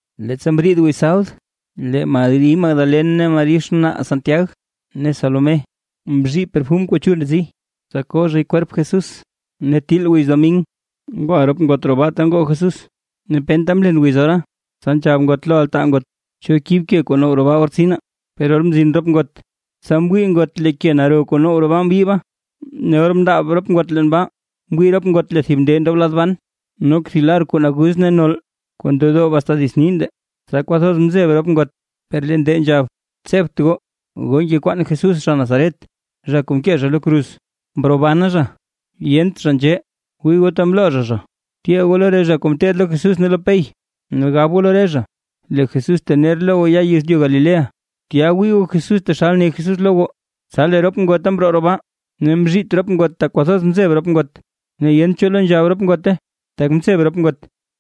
Leettsa mriid wiz sabd, lee Mari Magdalen ne Mari xnaa Santiag ne Salomé, mzhii perfum kuu chul ndetsi, tsa ko zhay kwerp Jesús. Ne til wiz domin, ngwa re ngot roo baa ta ngoo Jesús, ne penta mlen wiz ora. Tsa nzhab ngot lo altaa ngot: ―¿Cho kib ke kuu now roo baa or tsinaa? Per or mzin yon ngot, tsa mwii ngot lee ke naro kuu now roo baa mbyiiba. Ne or mndaab re ngot leen baa, mwii re ngot lee thib nde ndob lad ban, nok thib lar kuu naguz ne nol kuu ndedoob asta dits nii nde, tsa kwathoz mzeb re ngot. Per lee nde nzhab: ―Tsebt goo. Goo ngekwaan Jesús zha Nazaret, zha kuu mkee zha lo kruz. ¡Mrobana zha! ¡Yent zha nzhee! Wii goo ta mloo zha zha. Tyee goo lo re zha kuu mteed lo Jesús ne lo Pey. Ne gab goo lo re zha: “Lee Jesús tener lo goo ya yezlyu Galilea, tya wii goo Jesús taxal ne Jesús lo goo”. Tsa lee re ngota mroo roo baa, ne mzhiit re ngot tak kwathoz mzeb re ngot. Ne yent cho lo nzhab re ngote, tak nzeb re ngot.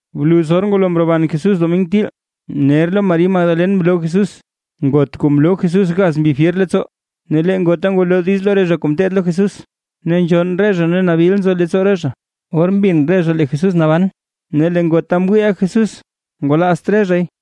Bluz or ngwalo mroban Jesús domin til, ner lo Mari Magdalen mloo Jesús, ngot kuu mloo Jesús gaz mbi fyer leettsoo. Ne lee ngota ngwalo diiz lo re zha kuu mteed lo Jesús, ne nzhonn re zha ne nabil nzo leettsoo re zha. Or mbin re zha lee Jesús naban, ne lee ngota mwiiʼa Jesús, ngwalaazt re zhay.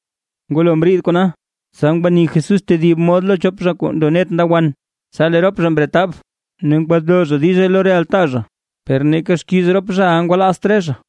Ngwalo mriid kona, tsa ngwani Jesús tedib mod lo chop zha kuu ndo net nda wan. Tsa lee rop zha mretab; ne ngwalo zha diize lo re altaa zha, per neeka xkiiz rop zhaʼa ngwalaazt re zha.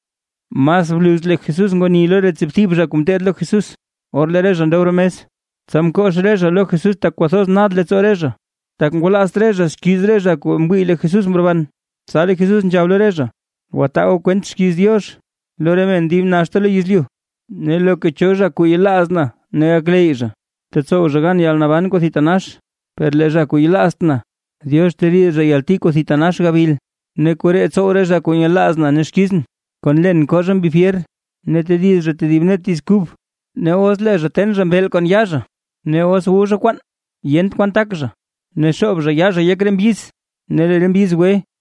Mas bluz lee Jesús ngwani lo re tsiibthib zha kuu mteed lo Jesús. Or lee re zha ndob roo mes, tsa mkox re zha lo Jesús tak kwathoz nad leettsoo re zha, tak ngwalaazt re zha xkiiz re zha kuu mwii lee Jesús mroban. Tsa lee Jesús nzhab lo re zha: ―Gwataa goo kwent xkiiz Diox lo re men dib naxta lo yezlyu. Ne loka cho zha kuu yelaaz na ne gakleyy zha, tetsow zha gan yalnaban kuu thitanax; per lee zha kuu yelaazt na, Diox teriid zha yalti kuu thitanax gabil. Ne koree tsow re zha kuu nyelaaz na ne xkizʼn: Kon len koo zha mbi fyer; ne tediz zha tedib net diiz kub. Ne os lee zha ten zha mbeel kon yaa zha; ne os wu zha kwaan yent kwan tak zha, ne xoob zha yaa zha yek re mbyiz, ne lee re mbyiz gwe.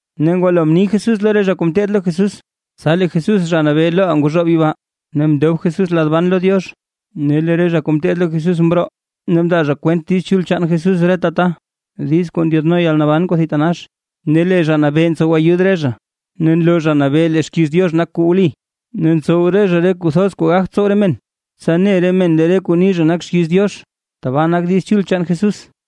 Ne ngwalo mni Jesús lo re zha kuu mteed lo Jesús, tsa lee Jesús Zha Nabee loʼaa ngwazhoob yibaa, ne mndob Jesús lad ban lo Diox. Ne lee re zha kuu mteed lo Jesús mroo, ne mndaa kwent Diiz Chul chaan Jesús reta ta, diiz kuu ndyaadno yalnaban kuu thitanax. Ne lee Zha Nabee ntsow ayud re zha, ne nloo Zha Nabee lee xkiiz Diox nak kuu wli, ne ntsow re zha re kuu thoz kuu gagt tsow re men, tsa ne re men lee re kuu ni re zha nak xkiiz Diox. ¡Tbaa nak diiz chul chaan Jesús!